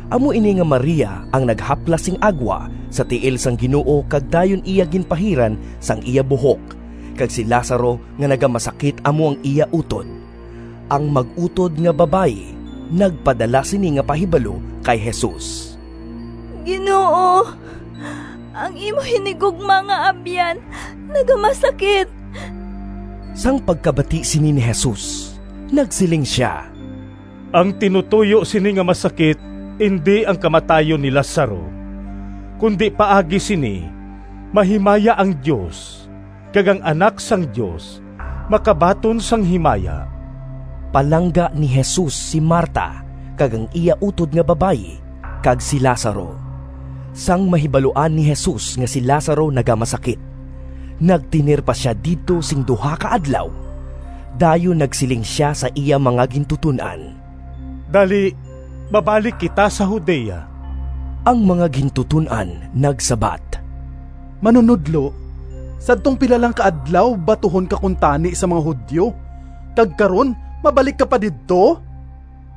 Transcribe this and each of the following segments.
(Amo ini nga Maria ang naghaplas sing agwa sa tiil sang Ginoo kag dayon iya ginpahiran sang iya buhok, kag si Lazaro nga nagamasakit amo ang iya utod.) Ang mag-utod nga babayi nagpadala sini nga pahibalo kay Jesus, “Ginoo, ang imo hinigugma nga abyan nagamasakit.” Sang pagkabati sini ni Jesus, nagsiling sia, “Ang tinutoyo sini nga masakit indi ang kamatayon ni Lazaro, kundi paagi sini mahimaya ang Dios, kag ang Anak sang Dios makabaton sang himaya.” Palangga ni Jesus si Marta kag ang iya utod nga babayi, kag si Lazaro. Sang mahibaluan ni Jesus nga si Lazaro nagamasakit, nagtener pa sia didto sing duha ka adlaw. Dayon nagsiling sia sa iya mga gintuton-an, “Dali, mabalik kita sa Judea.” Ang mga gintuton-an nagsabat, “Manunodlo, sadtong pila lang ka adlaw batuhon ka kuntani sang mga Judio, kag karon mabalik ka pa didto?”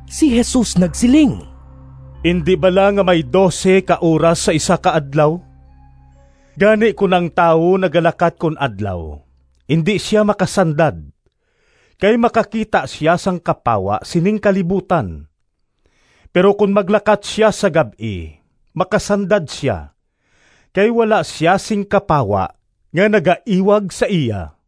Si Jesus nagsiling, “Indi bala nga may dose ka oras sa isa ka adlaw? Gani kon ang tawo nagalakat kon adlaw indi sia makasandad, kay makakita sia sang kapawa sining kalibutan. Pero kon maglakat sia sa gab-i makasandad sia, kay wala sia sing kapawa nga nagaiwag sa iya.”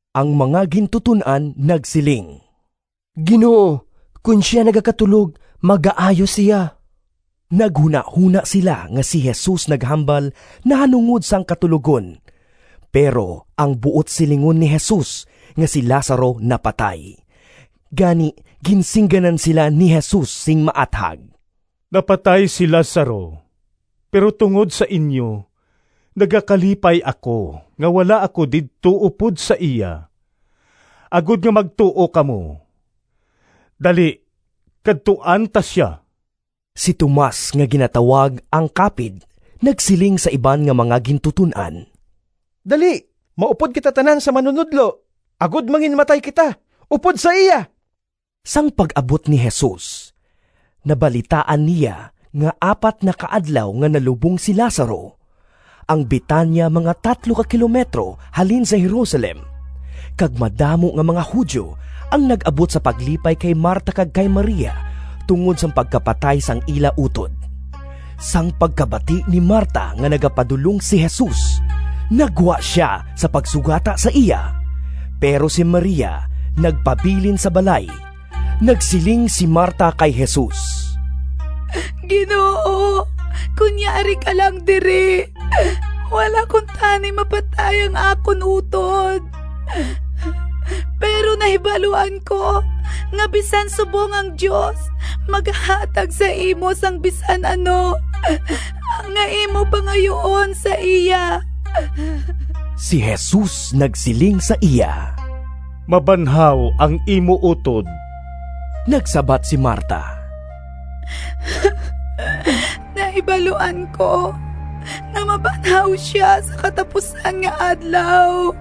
Ang mga gintuton-an nagsiling, “Ginoo, kon sia nagakatulog, magaayo sia.” Naghunahona sila nga si Jesus naghambal nahanungod sang katulogon, pero ang buot silingon ni Jesus nga si Lazaro napatay. Gani ginsingganan sila ni Jesus sing maathag, “Napatay si Lazaro, pero tungod sa inyo nagakalipay ako nga wala ako didto upod sa iya, agod nga magtuo kamo. Dali kadtuan ta sia.” Si Tomas nga ginatawag ang Kapid nagsiling sa iban nga mga gintuton-an, “Dali, maupod kita tanan sa Manunodlo, agod manginmatay kita upod sa iya!” Sang pag-abot ni Jesus, nabalitaan niya nga apat na ka adlaw nga nalubong si Lazaro. Ang Betania mga tatlo ka kilometro halin sa Jerusalem, kag madamo nga mga Judio ang nag-abot sa paglipay kay Marta kag kay Maria tungod sang pagkapatay sang ila utod. Sang pagkabati ni Marta nga nagapadulong si Jesus, naggwa sia sa pagsugata sa iya, pero si Maria nagpabilin sa balay. Nagsiling si Marta kay Jesus, “Ginoo, kon yari ka lang diri, wala kuntani mapatay ang akon utod! Pero nahibaluan ko nga bisan subong ang Dios magahatag sa imo sang bisan ano nga imo pangayuon sa iya.” Si Jesus nagsiling sa iya, “Mabanhaw ang imo utod.” Nagsabat si Marta, “Nahibaluan ko nga mabanhaw sia sa katapusan nga adlaw.”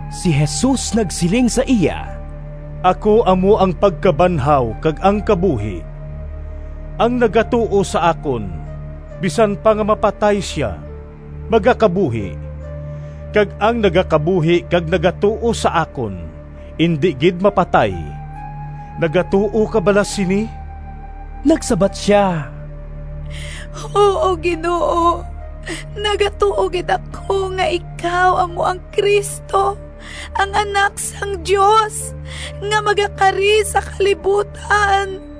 Si Jesus nagsiling sa iya, “Ako amo ang pagkabanhaw kag ang kabuhi. Ang nagatuo sa akon, bisan pa nga mapatay sia, magakabuhi; kag ang nagakabuhi kag nagatuo sa akon indi gid mapatay. Nagatuo ka bala sini?” Nagsabat sia, “Huo, Ginoo! Nagatuo gid ako nga ikaw amo ang Cristo, ang Anak sang Dios, nga magakari sa kalibutan.”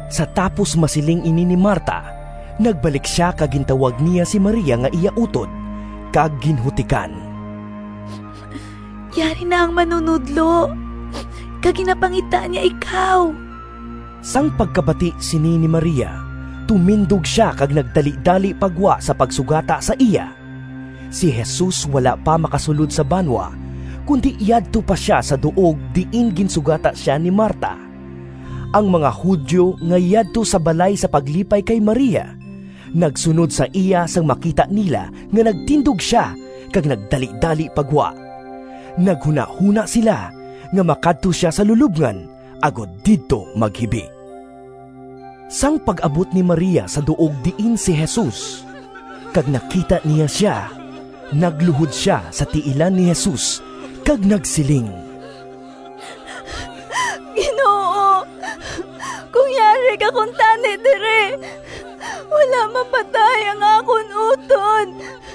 Sa tapos masiling ini ni Marta, nagbalik sia kag gintawag niya si Maria nga iya utod, kag ginhutikan, “Yari na ang Manunodlo, kag ginapangita niya ikaw.” Sang pagkabati sini ni Maria tumindog sia kag nagdalidali pa gwa sa pagsugata sa iya. (Si Jesus wala pa makasulod sa banwa, kundi yadto pa sia sa duog diin ginsugata sia ni Marta.) Ang mga Judio nga yadto sa balay sa paglipay kay Maria, nagsunod sa iya sang makita nila nga nagtindog sia kag nagdalidali pa gwa. Naghunahona sila nga makadto sia sa lulobngan, agod didto maghibi. Sang pag-abot ni Maria sa duog diin si Jesus, kag nakita niya sia, nagluhod sia sa tiilan ni Jesus kag nagsiling, “Ginoo, kon yari ka kuntani diri, wala mapatay ang akon utod!”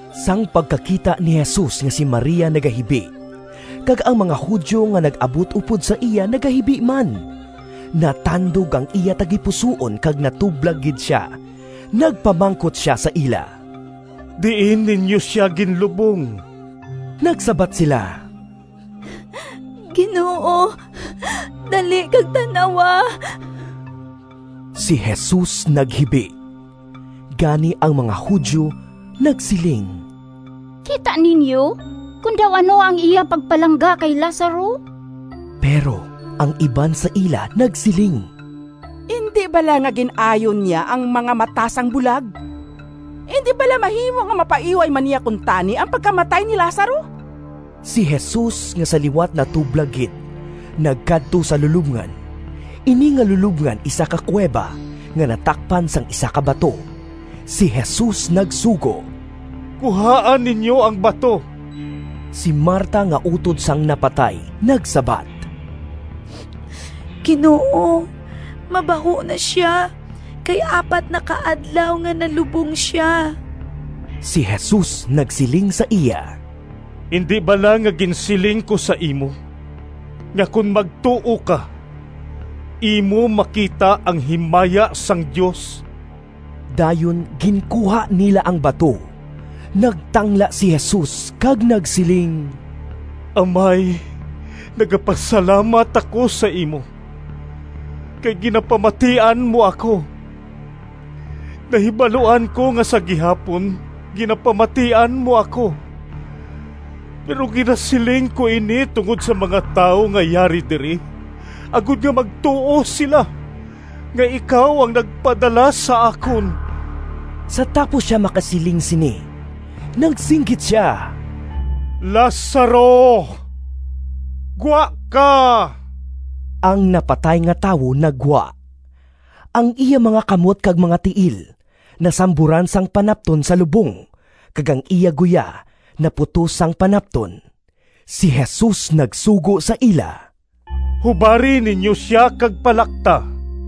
Sang pagkakita ni Jesus nga si Maria nagahibi, kag ang mga Judio nga nag-abot upod sa iya nagahibi man, natandog ang iya tagipusoon kag natublag gid sia. Nagpamangkot sia sa ila, “Diin ninyo sia ginlubong?” Nagsabat sila, “Ginoo, dali kag tan-awa.” Si Jesus naghibi. Gani ang mga Judio nagsiling, “Kita ninyo kon daw ano ang iya pagpalangga kay Lazaro!” Pero ang iban sa ila nagsiling, “Indi bala nga gin-ayo niya ang mga mata sang bulag? Indi bala mahimo nga mapaiway man niya kuntani ang pagkamatay ni Lazaro?” Si Jesus nga sa liwat natublag gid, nagkadto sa lulobngan. Ini nga lulobngan isa ka kuweba nga natakpan sang isa ka bato. Si Jesus nagsugo, “Kuhaa ninyo ang bato.” Si Marta nga utod sang napatay, nagsabat, “Ginoo, mabaho na sia, kay apat na ka adlaw nga nalubong sia!” Si Jesus nagsiling sa iya, “Indi bala nga ginsiling ko sa imo nga kon magtuo ka, imo makita ang himaya sang Dios?” Dayon ginkuha nila ang bato. Nagtangla si Jesus kag nagsiling, “Amay, nagapasalamat ako sa imo, kay ginapamatian mo ako. Nahibaluan ko nga sa gihapon ginapamatian mo ako, pero ginasiling ko ini tungod sa mga tawo nga yari diri, agod nga magtuo sila nga ikaw ang nagpadala sa akon.” Sa tapos sia makasiling sini nagsinggit sia, “Lazaro, gwa ka!” Ang napatay nga tawo naggwa. Ang iya mga kamot kag mga tiil nasamburan sang panapton sa lubong, kag ang iya guya naputos sang panapton. Si Jesus nagsugo sa ila, “Hubari ninyo sia, kag palakta.”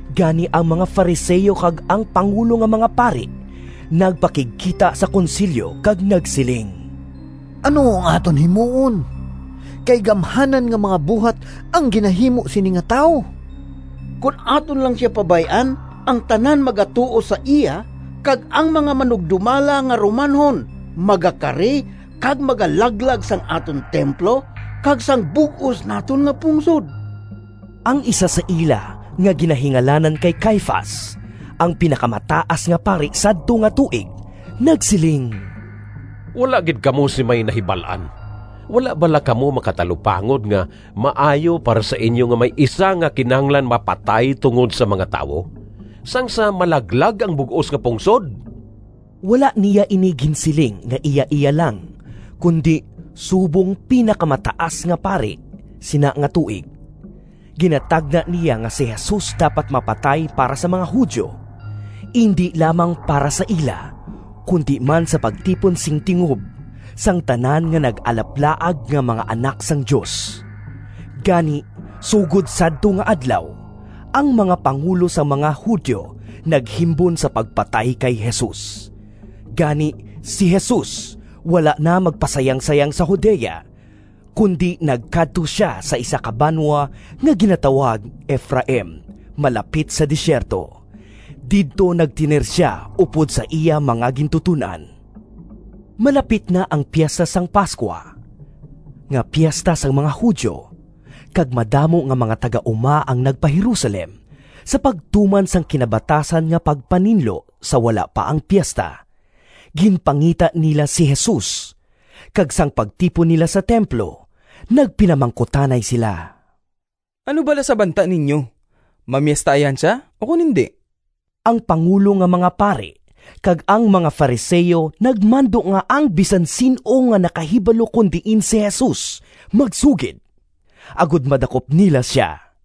Gani ang mga Fariseo kag ang pangulo nga mga pari nagpakigkita sa konsilyo kag nagsiling, “Ano ang aton himuon, kay gamhanan nga mga buhat ang ginahimo sini nga tawo? Kon aton lang sia pabay-an, ang tanan magatuo sa iya, kag ang mga manugdumala nga Romanhon magakari kag magalaglag sang aton templo kag sang bug-os naton nga pungsod!” Ang isa sa ila nga ginahingalanan kay Caifas, ang Pinakamataas nga Pari sadto nga tuig, nagsiling, “Wala gid kamo sing may nahibal-an! Wala bala kamo makatalupangod nga maayo para sa inyo nga may isa nga kinahanglan mapatay tungod sa mga tawo, sang sa malaglag ang bug-os nga pungsod?” (Wala niya ini ginsiling nga iyaiya lang, kundi subong Pinakamataas nga Pari sina nga tuig, ginatagna niya nga si Jesus dapat mapatay para sa mga Judio. Indi lamang para sa ila, kundi man sa pagtipon sing tingob sang tanan nga nag-alaplaag nga mga anak sang Dios.) Gani sugod sadto nga adlaw, ang mga pangulo sang mga Judio naghimbon sa pagpatay kay Jesus. Gani si Jesus wala na magpasayangsayang sa Judea, kundi nagkadto sia sa isa ka banwa nga ginatawag Efraim malapit sa desierto. Didto nagtener sia upod sa iya mga gintuton-an. Malapit na ang Piesta sang Pascua, nga piesta sang mga Judio, kag madamo nga mga taga-uma ang nagpa-Jerusalem sa pagtuman sang kinabatasan nga pagpaninlo sa wala pa ang piesta. Ginpangita nila si Jesus, kag sang pagtipon nila sa templo nagpinamangkutanay sila, “Ano bala sa banta ninyo? Mamiesta ayhan sia ukon indi?” Ang pangulo nga mga pari kag ang mga Fariseo nagmando nga ang bisan sin-o nga nakahibalo kon diin si Jesus magsugid, agod madakop nila sia.